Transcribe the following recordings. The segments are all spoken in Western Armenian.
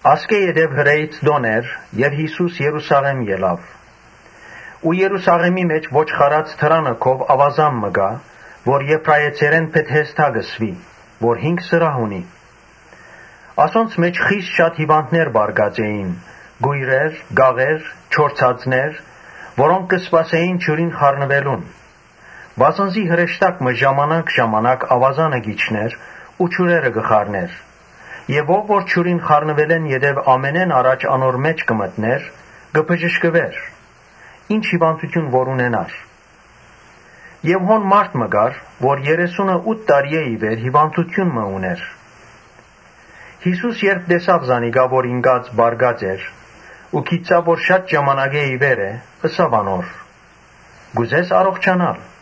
Ասկէ յետոյ Հրէից տօնն էր։ Յիսուս Երուսաղէմ ելաւ։ Երուսաղէմի մէջ Ոչխարներու դրանը քով աւազան մը կար, որ Եբրայեցերէն Բեթհեզդա կը կոչուէր, որ հինգ սրահ ունէր։ Ասոնց մէջ խիստ շատ հիւանդներ պառկած էին՝ կոյրեր, կաղեր, չորցածներ՝ որոնք կը սպասէին ջուրին խառնուելուն, Վասն զի հրեշտակ մը ժամանակ ժամանակ աւազանը կ’իջնէր ու ջուրերը կը խառնէր եւ ո՛վ որ ջուրին խառնուելէն յետոյ ամենէն առաջ անոր մէջ մտնէր, կը բժշկուէր ի՛նչ հիւանդութիւն ալ որ ունենար։ Հոն մարդ մը կար, որ երեսունըութը տարիէ ի վեր հիւանդութիւն մը ունէր։ Յիսուս երբ տեսաւ զանիկա, որ ինկած պառկած էր, գիտցաւ թէ շատ ժամանակէ ի վեր է, ըսաւ անոր. «Կ’ուզե՞ս առողջանալ»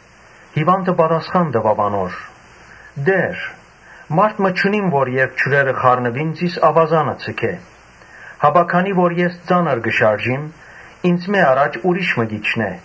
Հիւանդը պատասխան տուաւ անոր. «Տէ՛ր, մարդ մը չունիմ որ երբ ջուրերը խառնուին՝ զիս աւազանը ձգէ ու քանի որ ես ծանր կը շարժիմ, ինծմէ առաջ ուրիշ մը կ’իջնէ»։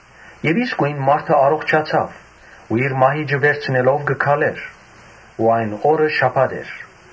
Իսկոյն մարդը առողջացաւ ու իր մահիճը վերցնելով կը քալէր։ Այն օրը շաբաթ էր։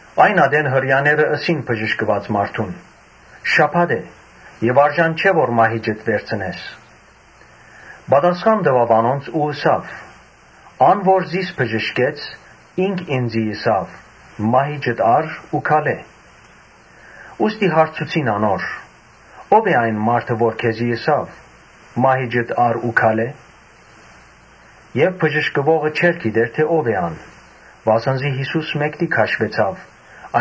Այն ատեն Հրեաները ըսին բժշկուած մարդուն. «Շաբաթ է եւ ներելի չէ որ մահիճդ վերցնես»։ Պատասխան տուաւ անոնց ու ըսաւ. «Ան որ զիս բժշկեց՝ ի՛նք ինծի ըսաւ՝ ‘Մահիճդ ա՛ռ ու քալէ’»։ Ուստի հարցուցին անոր. «Ո՞վ է այն մարդը, որ քեզի ըսաւ, ‘Մահիճդ ա՛ռ ու քալէ’»։ Եւ բժշկուողը չէր գիտեր թէ ո՛վ է ան, վասն զի Յիսուս մէկդի քաշուեցաւ՝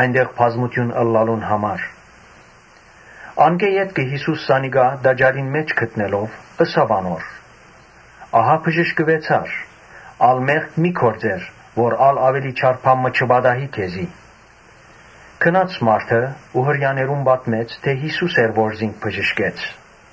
այնտեղ բազմութիւն ըլլալուն համար։ Անկէ ետքը Յիսուս զանիկա տաճարին մէջ գտնելով՝ ըսաւ անոր. «Ահա բժշկուեցար, ալ մեղք մի՛ գործեր, որ ա՛լ աւելի չար բան չպատահի քեզի»։ Գնաց մարդը ու Հրեաներուն պատմեց թէ՝ Յիսուս էր, որ զինք բժշկեց։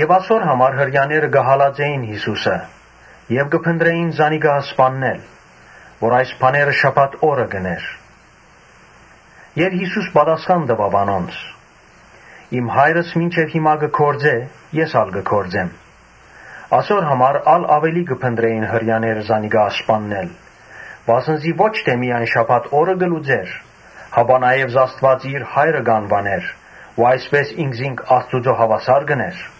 Ասոր համար Հրեաները կը հալածէին Յիսուսը եւ կը մտածէին զանիկա սպաննել, քանի որ այս բաները շաբաթ օրը կ’ընէր։ Եւ Յիսուս պատասխան տուաւ անոնց. «Իմ Հայրս մինչեւ հիմա կը գործէ, ես ալ կը գործեմ»։ Ասոր համար ա՛լ աւելի կը մտածէին Հրեաները զանիկա սպաննել, վասն զի ո՛չ միայն շաբաթ օրը չէր պահեր, հապա նաեւ Աստուած իր Հայրը կ’անուանէր ու այսպէս ինքզինք Աստուծոյ հաւասար կ’ընէր։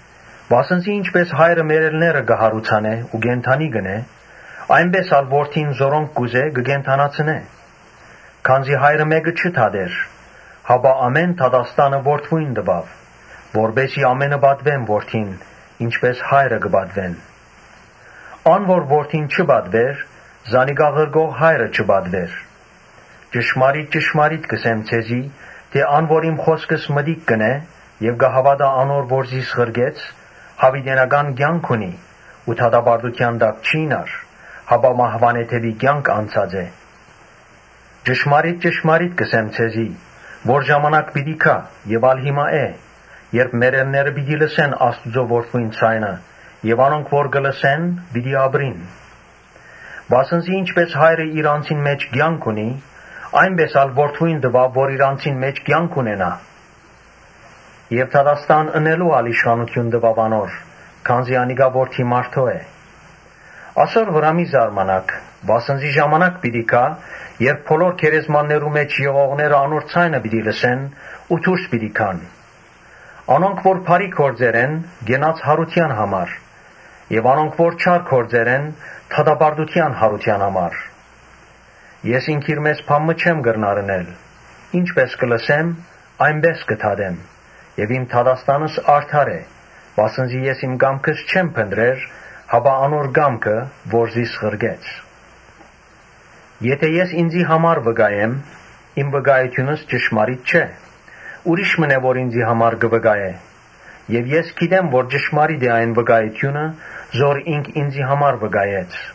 Վասն զի ինչպէս Հայրը մեռելները կը յարուցանէ ու կը կենդանացնէ, այնպէս ալ Որդին որոնք կ’ուզէ կը կենդանացնէ։ Քանզի Հայրը մէ՛կը չի դատեր, հապա ամէն դատաստան Որդիին տուաւ. Որպէս զի ամէնքը պատուեն Որդին, ինչպէս Հայրը կը պատուեն։ Ան որ Որդին չի պատուեր, զանիկա ղրկող Հայրը չի պատուեր։ Ճշմարիտ ճշմարիտ կ’ըսեմ ձեզի թէ ‘Ան որ իմ խօսքս մտիկ կ’ընէ եւ կը հաւատայ անոր որ զիս ղրկեց, յաւիտենական կեանք ունի ու դատապարտութեան տակ չիյնար, հապա մահուանէ դէպի կեանք անցած է’։ Ճշմարիտ ճշմարիտ կ’ըսեմ ձեզի թէ Ժամանակ պիտի գայ եւ հիմա ալ է, երբ մեռելները պիտի լսեն Աստուծոյ Որդիին ձայնը եւ անոնք որ կը լսեն, պիտի ապրին։ Վասն զի ինչպէս Հայրը իր անձին մէջ կեանք ունի, այնպէս ալ Որդիին տուաւ, որ իր անձին մէջ կեանք ունենայ, Եւ դատաստան ընելու իշխանութիւն ալ տուաւ անոր, քանզի անիկա Որդի մարդոյ է։ Ասոր վրայ մի՛ զարմանաք. վասն զի ժամանակ պիտի գայ՝ երբ բոլոր գերեզմաններուն մէջ եղողները անոր ձայնը պիտի լսեն, Ու դուրս պիտի գան։ Անոնք որ բարի գործեր են՝ կեանքի յարութեան համար եւ անոնք որ չար գործեր են՝ դատապարտութեան յարութեան համար»։ Ես ինքնիրմէս բան մը չեմ կրնար ընել. ինչպէս կը լսեմ, այնպէս կը դատեմ եւ իմ դատաստանս արդար է, վասն զի ես իմ կամքս չեմ փնտռեր, հապա Ոմանք, Հօրըանոր կամքը որ զիս ղրկեց։ Եթէ ես ինծի համար վկայեմ, իմ վկայութիւնս ճշմարիտ չէ։ Ուրիշ մըն է, որ ինծի համար կը վկայէ եւ ես գիտեմ թէ ճշմարիտ է այն վկայութիւնը՝ որ ինք ինծի համար վկայեց։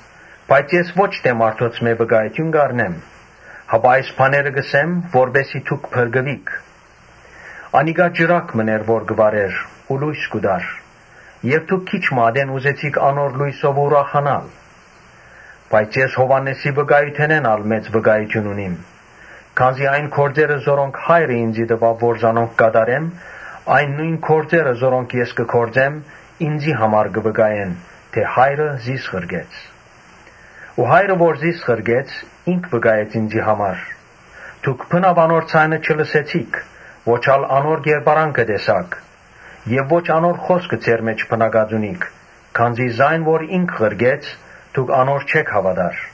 Բայց ես պէտք չունիմ մարդոց վկայութեան։ Այս բաները կ’ըսեմ, որպէս զի դուք փրկուիք։ Անիկա ճրագ մըն էր, որ կը վառէր ու լոյս կու տար եւ դուք քիչ մը ատեն ուզեցիք անոր լոյսովը ուրախանալ։ Բայց ես Յովհաննէսին վկայութենէն ալ մեծ վկայութիւն մը ունի, քանզի այն գործերը որոնք Հայրը ինծի տուաւ որ կատարեմ, այն նոյն գործերը որոնք ես կը գործեմ, ինծի համար կը վկայեն թէ ‘Հայրը զիս ղրկեց’։ Հայրը, որ զիս ղրկեց, ինք վկայեց ինծի համար։ Դուք անոր ձայնը չլսեցիք, ո՛չ ալ անոր կերպարանքը տեսաք Ո՛չ ալ անոր խօսքը ձեր մէջ բնակած է, քանզի զայն որ ինք ղրկեց, դուք անոր չէք հաւատար։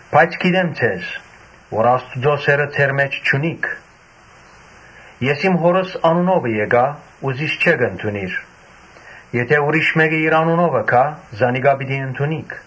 Բայց գիտեմ թէ Աստուծոյ սէրը ձեր մէջ չունիք։ Ես իմ Հօրս անունովը եկայ ու զիս չէք ընդունիր եթէ ուրիշ մէկը իր անունովը գայ, զանիկա պիտի ընդունիք։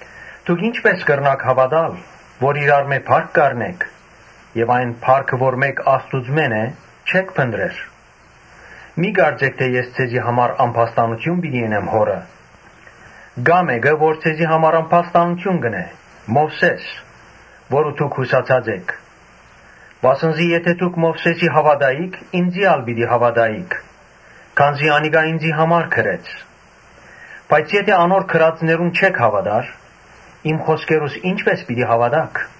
Դուք ի՞նչպէս կրնաք հաւատալ, երբ իրարմէ փառք կ’ակնկալէք եւ այն փառքը որ Աստուծմէն է՝ չէք փնտռեր։ Մի՛ կարծէք թէ ես ձեզի համար ամբաստանութիւն պիտի ընեմ Հօրը։ Կայ մէկը՝ որ ձեզի համար ամբաստանութիւն կ’ընէ։ Մովսէսը՝ որուն դուք յուսացած էք։ Վասն զի եթէ դուք Մովսէսին հաւատայիք, ինծի ալ պիտի հաւատայիք, քանզի անիկա ինծի համար գրեց։ Բայց եթէ անոր գրածներուն չէք հաւատար, իմ խօսքերուս ի՞նչպէս պիտի հաւատաք։